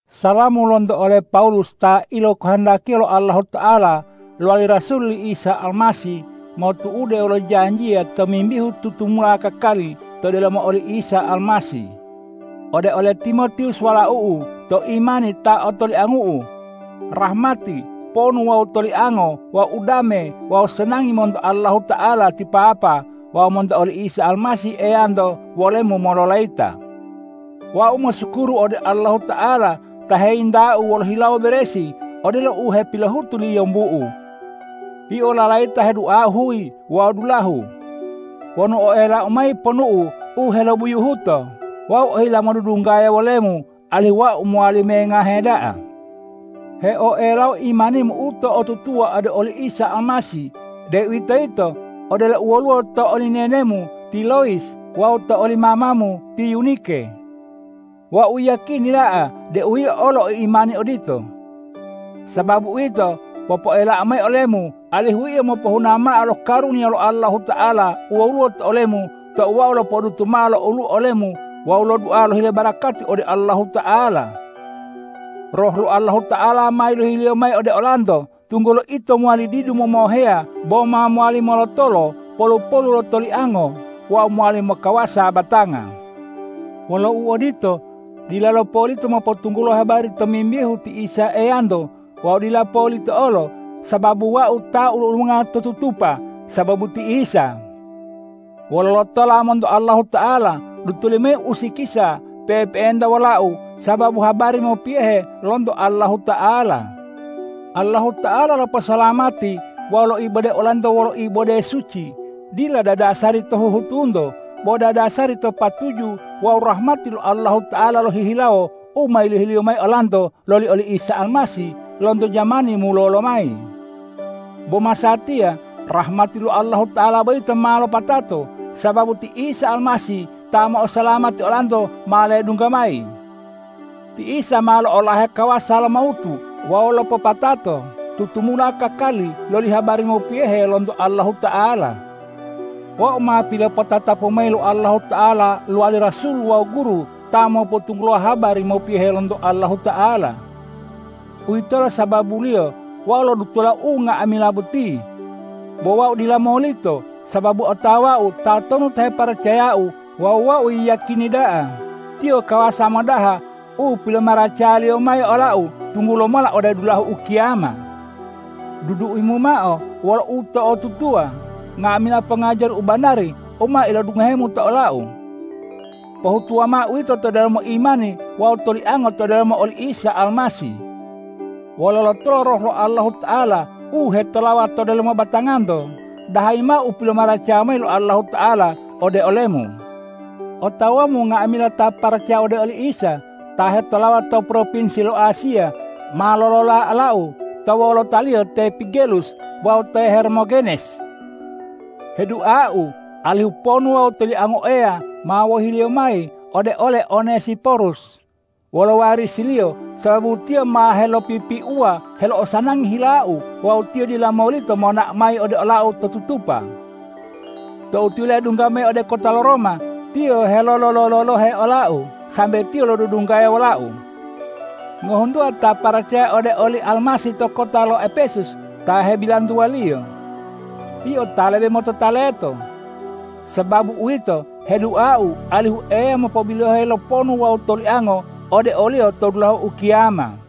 Salamu lonto ole Pawulus ta ilokohondakiya lo Allahuta'ala lowali rasul li Isa Almasih motu'ude wolo janjiya tomimbihu tutumula kakali to delomo oli Isa Almasih ode ole Timotiwus walau'u to imani ta otoliangu'u. Rahmati, ponu wawu toliango wawu udame wawu sanangi monto Allahuta'ala ti Papa wawu monto oli Isa Almasih Eyanto wolemu mololayita. Wau mosukuru ode Allahuta'ala ta heyintau wolo hilawo beresi odelo u hepilohutu li yombu'u. Yio lalayita heduau huyi wawu dulahu. Wonu oelau mayi ponumu u helobuyuhuto, wau ohila modudunggaya wolemu, alihu wau mowali mengahe da'a. Heoelau imanimu u to'otutuwa ode oli Isa Almasih, deuwitoyito odelo u woluwo to oli nenemu ti Loyis wawu to oli mamamu ti Yunike. Wau yiyakini da'a deu yio olo o imani odito. Sababu uwito, popoelau mayi olemu alihu yio mopohuna mao lo karuniya lo Allahuta'ala u woluwo to olemu tou wau lopodutu mao lo olu'u to olemu wawu lodua lohile barakati ode Allahuta'ala. Roh lo Allahuta'ala ma yilohi-Liyo mayi ode olanto, tunggulo ito mowali didu momoheya bo ma mowali molotolo polu-polu lo toliango wawu mowali mokawasa batanga. Wolo uodito, dilalo polito mopotunggulo habari tomimbihu ti Isa Eyanto wawu dila polita olo sababu wau ta ulu-ulunga to tutupa sababu ti Isa. Wolo lotola monto Allahuta'ala, dutoli mayi usikisa pe'epe'enta wolau sababu habari mopiyohe lonto Allahuta'ala. Allahuta'ala loposalamati wawu loibode olanto wolo ibode suci, dila dadasari to huhutunto, bo dadasari to patuju wawu rahmati lo Allahuta'ala lohihilawo u ma yilohi-Liyo mayi olanto loli oli Isa Almasih lonto jamani mulolo mayi. Bo masatiya rahmati lo Allahuta'ala boyito ma lopatato, sababu ti Isa Almasih ta mo'osalamati olanto ma ledungga mayi. Ti Isa ma lo'olahe kawasa lo mawutu wawu lopopatato tutumula kakali loli habari mopiyohe lonto Allahuta'ala. Wau ma pilopotatapu mayi lo Allahuta'ala lowali rasul wawu guru ta mopotunggulo habari mopiyohe lonto Allahuta'ala. Uwitolo sababuliyo wau lodutola unga'amila boti. Bo wau dila molito, sababu otawau tatonu ta heparacayau wawu wau yiyakini da'a Tiyo kawasa modaha u pilomaracaya-Liyo mayi olau tunggula mola ode dulahu ukiyama. Duduimu mao wolo uto'otutuwa nga'amila pongajari u banari u ma ilodungohemu to olau. Pohutuwa mao uwito to delomo imani wawu toliango to delomo oli Isa Almasih. Wolo lotolo Roh lo Allahuta'ala u hetolawa to delomo batanganto, dahayi mao u pilomaracaya mayi lo Allahuta'ala ode olemu. Otawamu nga'amila ta paracaya ode oli Isa, ta hetolawa to propinsi lo Asiya, ma lolola olau, to wolotaliyo te Pigelus wawu te Hermogenes. Heduau alihu ponu wawu toliango Eya ma wohi-Liyo mayi ode ole Onesiporus wolo warisiliyo, sababu tiyo ma helopipiuwa helo'osanangi hilau wawu tiyo dila molito monao mayi ode olau to tutupa. Tou tiyo ledungga mayi ode kota lo Roma, tiyo helolololohe olau sambe tiyo lodudunggaya wolau. Ngohuntuwa ta paracaya ode oli Almasih to kota lo Epesus ta hebilantuwaliyo. Yio ta lebe motota leto. Sababu uwito, heduau alihu Eya mopobiloheyi lo ponu wawu toliango ode oliyo to dulahu ukiyama.